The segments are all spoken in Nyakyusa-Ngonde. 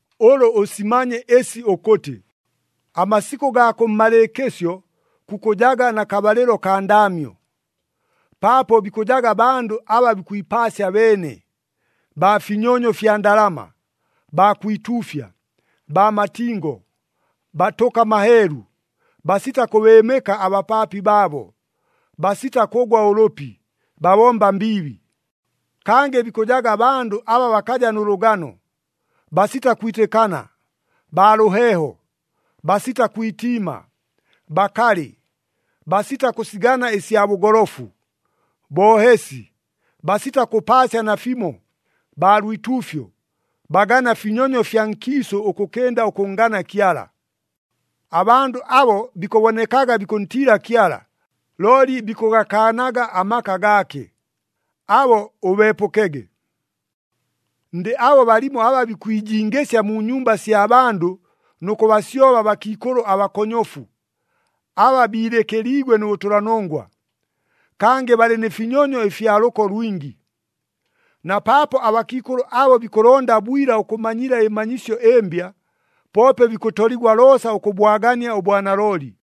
Ʉlʉ ʉsimanye ɨsi ʉkʉtɨ, amasikʉ gaa kʉmmalɨɨkɨsyo kukʉjaga na kabalɨlo kaa ndaamyo. Paapo bikʉjaga bandʉ aba bikwipaasya beene, baa finyonyo fya ndalama, baa kwituufya, baa matingo, batʉka maheelu, basita kʉbɨɨmɨka abapaapi baabo, basita kʉgwa ʉlʉpi, babomba mbiibi. Kangɨ bikʉjaga bandʉ aba bakaja nʉ lʉgano, basita kwitɨkana, baa lʉheeho, basita kwitiima, bakalɨ, basita kʉsigana ɨsya bʉgolofu, boohesi, basita kʉpaasya nafimo, baa lwituufyo, bagana finyonyo fya nkiisʉ ʉkʉkɨnda ʉkʉnngana Kyala. Abandʉ abo bikʉbonekaga bikʉntiila Kyala, looli bikʉgakaanaga amaka gaake. Abo ʉbeepʉkege. Ndɨ abo balimo aba bikwijingɨsya mu nyumba sya bandʉ nʉ kʉbasyoba abakiikʉlʉ abakonyofu, aba biilɨkɨliigwe nʉ bʉtʉlanongwa, kangɨ balɨ nɨ finyonyo ɨfya lʉko lwingi. Na paapo abakiikʉlʉ abo bikʉlonda bwila ʉkʉmanyila ɨmanyisyo ɨmbya, poope bikʉtoligwa loosa ʉkʉbwagania ʉbwanalooli.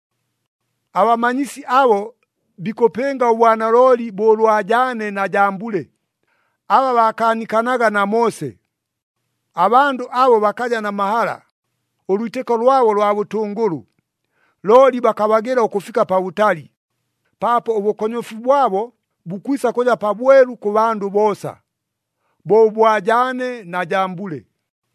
Abamanyisi abo bikʉpɨnga ʉbwanalooli bo ʉlwa Jaane na Jambule, aba baakaanikanaga na Moose. Abandʉ abo bakaja na mahala, ʉlwitɨko lwabo lwa bʉtʉngʉlʉ. Looli bakabagɨla ʉkʉfika pabʉtali, paapo ʉbʉkonyofu bwabo bukwisa kʉja pabwelu kʉ bandʉ boosa, bo ʉbwa Jaane na Jambule.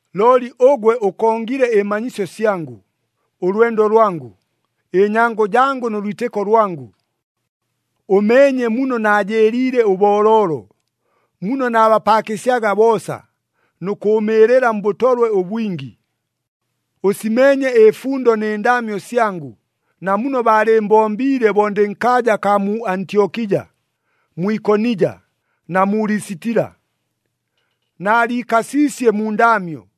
Looli ʉgwe ʉkongile ɨmanyisyo syangʉ, ʉlwendo lwangʉ, ɨnyango jangʉ nʉ lwitɨko lwangʉ. Ʉmeenye muno naajɨɨliile ʉbooloolo, muno naabapaakɨsyaga boosa, nʉ kʉʉmɨɨlɨla mbʉtolwe ʉbwingi. Ʉsimeenye ɨfundo nɨ ndaamyo syangʉ, na muno baalɨɨmbombiile bo ndɨ nkaaja akaa mu Antyokija, mu Ikonija na mu Lisitila. Naaliikasiisye mu ndaamyo,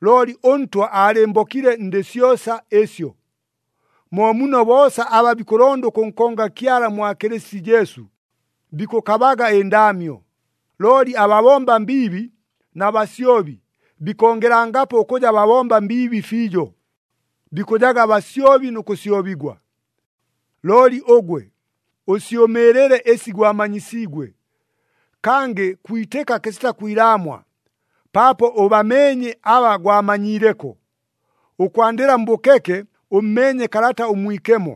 looli ʉNtwa aalɨmbokile ndɨ syosa ɨsyo. Mo muno boosa aba bikʉlonda ʉkʉnkonga Kyala mwa Kɨlɨsiti Jesu, bikʉkabaga ɨndaamyo, looli ababomba mbiibi na basyobi bikongelangapo ʉkʉja babomba mbiibi fiijo, bikʉjaga basyobi nʉ kʉsyobigwa. Looli ʉgwe, ʉsyʉmɨɨlɨle ɨsi gwamanyisiigwe, kangɨ kwitɨka kɨsita kwilaamwa, paapo ʉbameenye aba gwamanyiileko. Ʉkwandɨla mbʉkeke ʉmmeenye Kalata ʉMwikemo,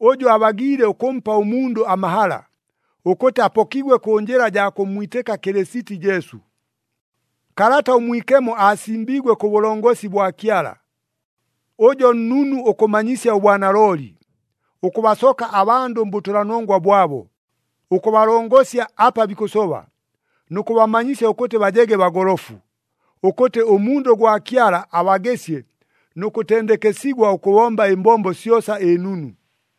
ʉjʉ abagiile ʉkʉmpa ʉmundʉ amahala, ʉkʉtɨ apokigwe kʉ njɨla jaa kʉmmwitɨka Kɨlɨsiti Jesu. Kalata ʉMwikemo aasimbiigwe kʉ bʉlongosi bwa Kyala. Ʉjo nnunu ʉkʉmanyisya ʉbwanalooli, ʉkʉbasoka abandʉ mbʉtʉlanongwa bwabo, ʉkʉbalongosya apa bikʉsoba, nʉ kʉbamanyisya ʉkʉtɨ bajege bagolofu, ʉkʉtɨ ʉmundʉ gwa Kyala abagɨsye nʉ kʉtendekesigwa ʉkʉbomba ɨmbombo syosa ɨnunu.